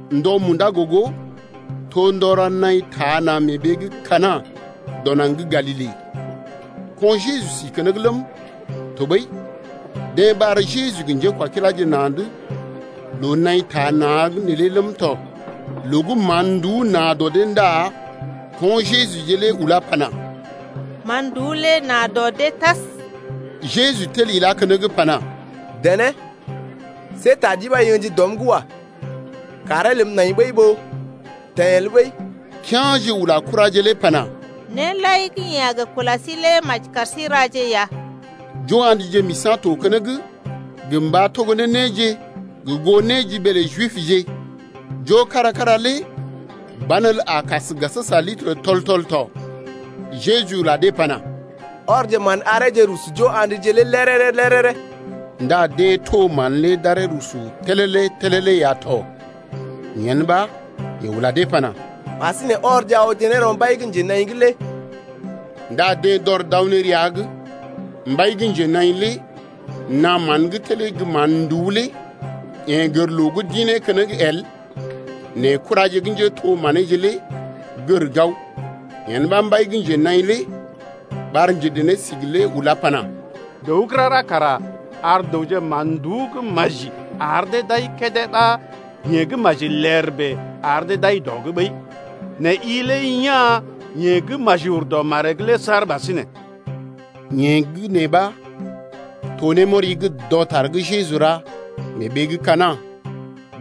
Ndɔ munda gogo to ndɔ ra naḭ taa na̰ mee ɓee gə́ Kana dɔ naŋg gə́ Galile. Ko̰ Jejuje si keneŋ ləm, tɔɓəi deḛ ɓar Jeju gə njékwakiláje na̰’d loo naḭ taa na̰’g neelé ləm tɔ. Loo gə́ mán-nduú na dɔ dee ndá ko̰ Jejuje lé ulá pana: Man-nduú lé na dɔ dee tas. Jeju tel ilá keneŋ pana: Dené see ta ɗi ɓa i ə̰ji dɔm’g wa. Kàree ləm nai ɓəi ɓó teḛ el ɓəi. Kea̰je ula kuraje lé pana: Néje lai gə́ yeḛ a gə kula sí lé maji kar sí raje ya. Jo-andje misa̰ to keneŋ gə mba togo ne néje gə goo néjiɓee lə Jibje. Jo kára-kára lé banelə a kas litər tɔl-tɔl tɔ. Jeju ula dee pana: Ɔrje mán areeje rusu jo a̰dje lé léréré-léréré. Ndá deḛ to mán lé d’aree rusu télélé-télélé ya tɔ. Yen ɓa yeḛ ula dee pana: Ɓasinè ɔrje awje ne rɔ mbai gə́ njenaḭ’g lé. Ndá deḛ d’ɔr d’aw ne rəa’g ya tɔ. Mbai gə́ njenaḭ lé naa mán gə́ telee gə́ mán-nduú lé. Yeḛ gər loo gə́ d’ḭ ne keneŋ el nɛ kuraje gə́ to njétho-maneeje lé gər gao. Yen ɓa mbai gə́ njenaḭ lé ɓar njedené-sigi lé ulá pana: Dəw gə́ rara kara ar dəwje mán-nduú gə́ maji ar dee d’ai kédé ɓa yeḛ gə́ maji ler bèe ar dee d’ai dɔ’d ɓəi. Nɛ i lé ya̰ yeḛ gə́ maji ur dɔ maree’g lé saar ɓasinè. Yee gə́ nee ɓa to némɔri gə́ dɔtar gə́ Jeju ra mee ɓee gə́ Kana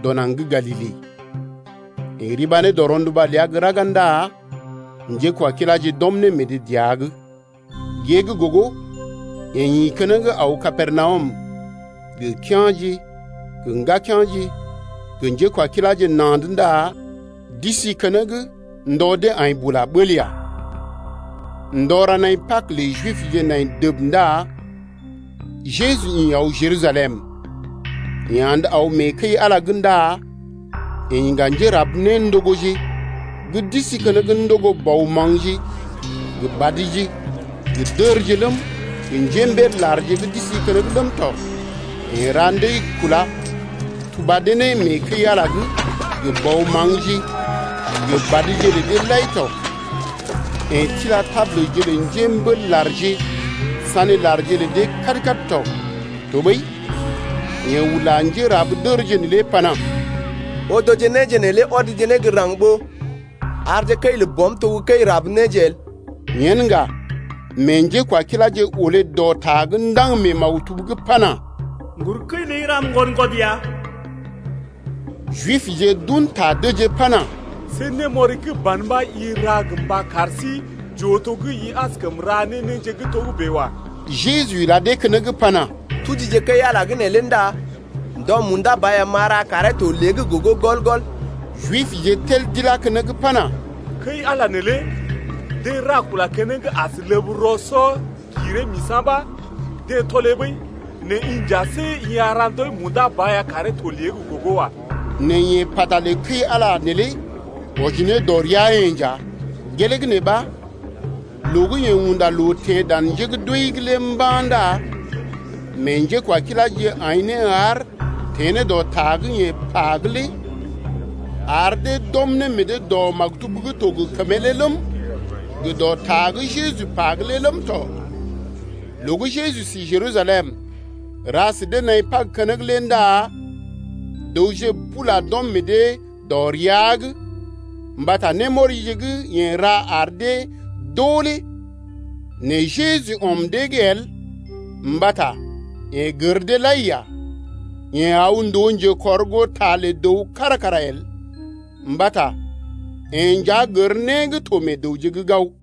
dɔ naŋg gə́ Galile. Yeḛ riba ne rɔ rɔnduba ləa gə́ raga ndá njékwakiláje d’ɔm ne meḛ dee dəa’g. Gée gə́ gogo yeḛ ḭ keneŋ aw Kapernawum gə kea̰je gə ŋgakea̰je gə njékwakiláje na̰’d ndá d’isi keneŋ ndɔ dee aḭ bula bəl ya. Ndɔ ra nai Pag lə Jibje nai dəb ndá Jeju ḭ aw Jerusalem. Yeḛ andə aw mee kəi-Ala’g ndá yeḛ iŋga njérab-néndogoje gə́ d’isi keneŋ ndogo bɔ maŋgje gə badje gə dərje ləm, gə njémbél-larje gə́ d’isi keneŋ ləm tɔ. Yeḛ ra ndəi-kúla tuba dee ne mee kəi-Ala’g gə bɔ maŋgje gə badje lə dee lai tɔ. Yeḛ tila tabulje lə njémbél-larje sané larje lə dee kad-kad tɔ. Tɔɓəi yeḛ ula njérab-dərje neelé pana: Odoje néje neelé ɔdje ne gə́ raŋg ɓó arje kəi lə Bɔm to gə́ kəi rab néje el. Yen ŋga mee njékwakiláje olé dɔ ta gə́ ndaŋg mee maktub’g pana: Ŋgur kəi ləi ram ŋgwɔd-ŋgwɔd ya. Jibje d’un ta dəjee pana: See némɔri gə́ ban ɓa i ra gə mba kar sí j’oo to gə́ i askəm ra ne néje gə́ togə́bè lé wa. Jeju ila dee keneŋ pana: Tujije kəi-Ala gə́ neelé ndá ndɔ munda ba ya m’a ra karee to lée’g gogo gɔl-gɔl. Jibje tel d’ilá keneŋ pana: Kəi-Ala neelé deḛ ra kula keneŋ as ləb rɔ-sɔ-giree-misa̰ ɓa deḛ tɔlee ɓəi, nɛ i nja see i a ra ndɔi munda ba ya karee to lée’g gogo wa. Nɛ yeḛ pata lə kəi-Ala neelé wɔji ne dɔ rəa-yeḛ nja. Gelee gə́ nee ɓa loo gə́ yeḛ unda loo teḛ dan njé gə́ d’wəi’g lé mba̰ ndá meḛ njékwakiláje aḭ ne haar teḛ ne dɔ ta gə́ yeḛ pa’g lé ar dee d’ɔm ne meḛ dee dɔ maktub gə́ to gə kəmee’g lé ləm, gə dɔ ta gə́ Jeju pa’g lé ləm tɔ. Loo gə́ Jeju si Jerusalem ra sə dee naḭ Pag keneŋ lé ndá dəwje bula d’ɔm meḛ dee dɔ ria’g mbata némɔrije gə́ yeḛ ra ar dee d’oo lé. Nɛ Jeju ɔm dee’g el mbata yeḛ gər dee lai ya. Yeḛ aw ndòo njekɔrgoota lə dəw kára kara el, mbata yeḛ nja gər né gə́ to meḛ dəwje’g gao.